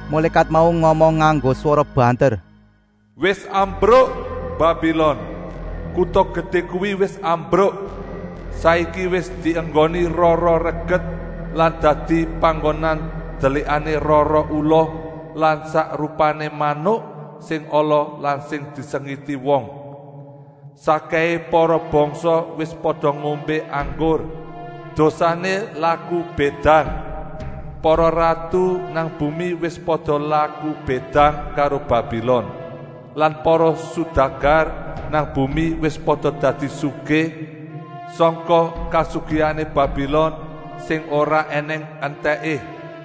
Mulékat mau ngomong nganggo swara banter: “Wis rubuh! Babilon, kuta gedé kuwi wis rubuh. Saiki wis dienggoni roh-roh reget lan dadi panggonan delikané roh-roh ula lan sak rupané manuk sing ala lan sing disengiti wong. Sakkèhé para bangsa wis pada ngombé anggur dosané laku bédang. Para ratu nang bumi wis pada laku bédang karo Babilon lan para sudagar nang bumi wis pada dadi sugih sangka kasugihané Babilon sing ora ènèng entèké.”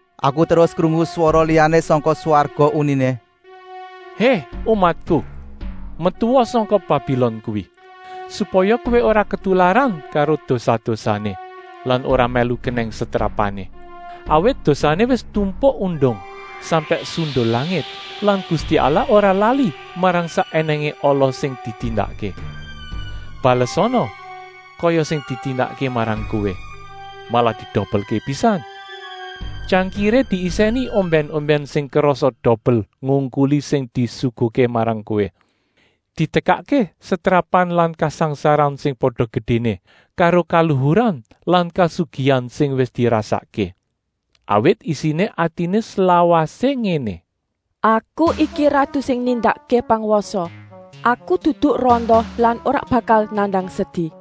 Aku terus krungu swara liyané sangka swarga uniné: “Hé umatku! Metua sangka Babilon kuwi! Supaya kowé ora ketularan karo dosa-dosané lan ora mèlu kenèng setrapané. Awit dosané wis tumpuk-undung sampèk sundul langit lan Gusti Allah ora lali marang sak ènèngé ala sing ditindakké. Balesana kaya sing ditindakké marang kowé, malah didobelké pisan. Tyangkiré diisèni ombèn-ombèn sing kerasé dobel ngungkuli sing disuguhké marang kowé. Ditekakké setrapan lan kasangsaran sing pada gedéné karo kaluhuran lan kasugihan sing wis dirasakké. Awit isiné atiné slawasé ngéné: ‘Aku iki ratu sing nindakké pangwasa. Aku dudu randa lan ora bakal nandang sedi.’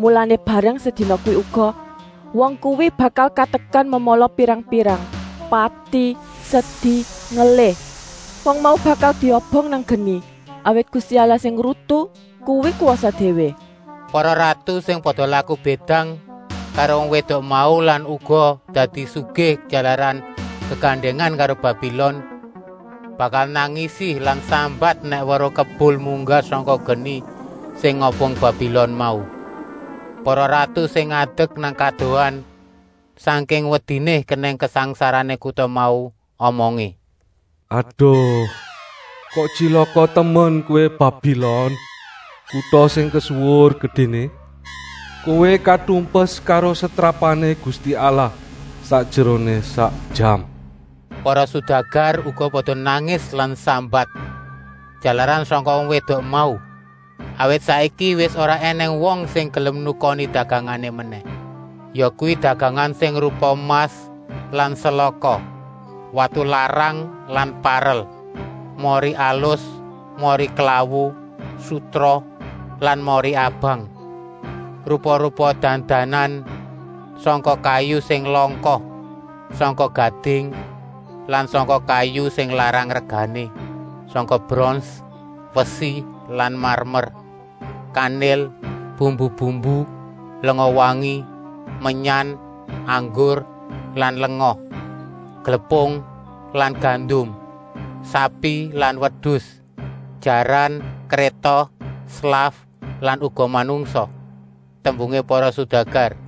Mulané bareng sedina kuwi uga, wong kuwi bakal katekan memala pirang-pirang: pati, sedi, ngelih. Wong mau bakal diobong nang geni, awit Gusti Allah sing ngrutu kuwi kwasa déwé.” Para ratu sing pada laku bédang karo wong wédok mau lan uga dadi sugih jalaran gegandèngan karo Babilon, bakal nangisi lan sambat nèk weruh kebul munggah sangka geni sing ngobong Babilon mau. Para ratu sing ngadek nang kadohan, sangking wediné kenèng kasangsarané kuta mau, omongé: “Aduh, kok tyilaka temen kowé Babilon, kuta sing kesuwur gedéné. Kowé katumpes karo setrapané Gusti Allah sakjeroné sak jam.” Para sudagar uga pada nangis lan sambat, jalaran sangka wong wédok mau, awit saiki wis ora ènèng wong sing gelem nukoni dagangané menèh. Yakuwi dagangan sing rupa emas lan selaka, watu larang lan parel, mori alus, mori purper, sutra lan mori abang, rupa-rupa dam-daman sangka kayu sing langka, sangka gading lan sangka kayu sing larang regané, sangka brons, wesi lan marmer, kanil, bumbu-bumbu, lenga-wangi, menyan, anggur lan lenga, glepung lan gandum, sapi lan wedus, jaran, kréta, slaf lan uga manungsa. Tembungé para sudagar: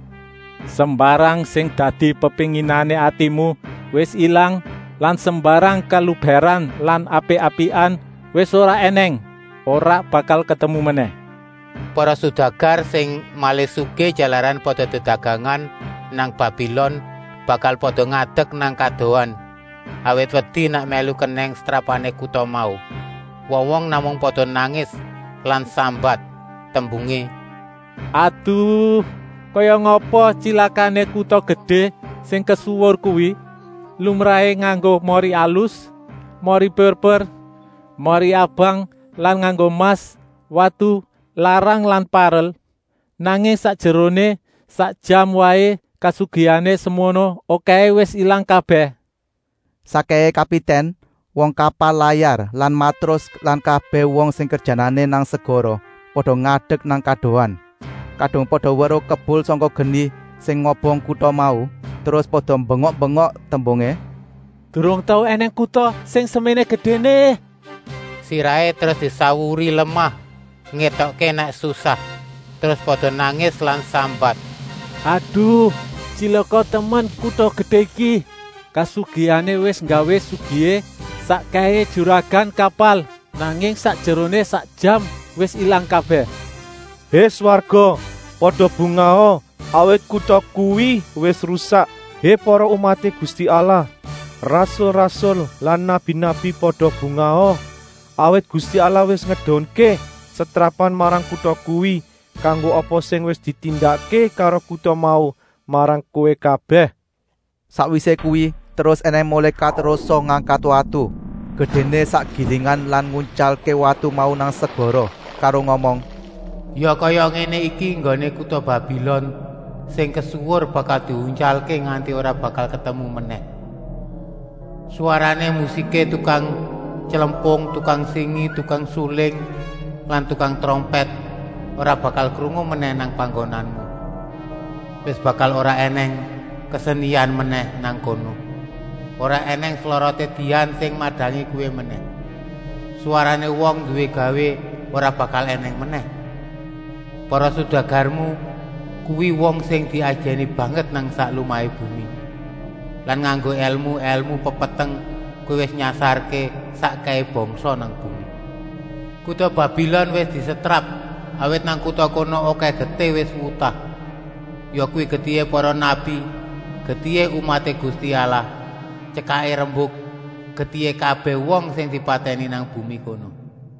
“Sembarang sing dadi pepénginané atimu wis ilang lan sembarang kalubèran lan apik-apikan wis ora ènèng, ora bakal ketemu menèh.” Para sudagar sing malih sugih jalaran pada dedagangan nang Babilon bakal pada ngadek nang kadohan, awit wedi nèk mèlu kenèng setrapané kuta mau. Wong-wong namung pada nangis lan sambat, tembungé: “Aduh, kaya ngapa tyilakané kuta gedé sing kesuwur kuwi. Lumrahé nganggo mori alus, mori purper, mori abang lan nganggo emas, watu larang lan parel. Nanging sakjeroné sak jam waé kasugihané semono okèhé wis ilang kabèh.” Sakkèhé kapitèn, wong kapal layar lan matrus lan kabèh wong sing kerjanané nang segara pada ngadek nang kadohan. Kadung pada weruh kebul sangka geni sing ngobong kuta mau, terus pada bengok-bengok tembungé: “Durung tau ènèng kuta sing seméné gedéné.” Sirahé terus disawuri lemah ngétokké nèk susah. Terus pada nangis lan sambat: “Aduh, tyilaka temen kuta gedé iki! Kasugihané wis nggawé sugihé sakkèhé juragan kapal. Nanging sakjeroné sak jam wis ilang kabèh.” Hé swarga, pada bungaha, awit kuta kuwi wis rusak. Hé para umaté Gusti Allah, rasul-rasul lan nabi-nabi, pada bungaha! Awit Gusti Allah wis ngedunké setrapan marang kuta kuwi kanggo apa sing wis ditindakké karo kuta mau marang kowé kabèh. Sakwisé kuwi terus ènèng mulékat rosa ngangkat watu, gedéné sak gilingan lan nguntyalké watu mau nang segara, karo ngomong: “Ya kaya ngéné iki enggoné kuta Babilon sing kesuwur bakal diuntyalké nganti ora bakal ketemu menèh. Swarané musiké tukang tylempung, tukang singi, tukang suling lan tukang trompèt ora bakal krungu menèh nang panggonanmu. Wis bakal ora ènèng kesenian menèh nang kono. Ora ènèng sloroté dian sing madangi kowé menèh. Swarané wong nduwé gawé ora bakal ènèng menèh. Para sudagarmu kuwi wong sing diajèni banget nang sak lumahé bumi. Lan nganggo èlmu-èlmu pepeteng kowé wis nyasarké sakkèhé bangsa nang bumi.” Kuta Babilon wis disetrap, awit nang kuta kono okèh getih wis wutah, yakuwi getihé para nabi, getihé umaté Gusti Allah, tyekaké rembuk: getihé kabèh wong sing dipatèni nang bumi kono.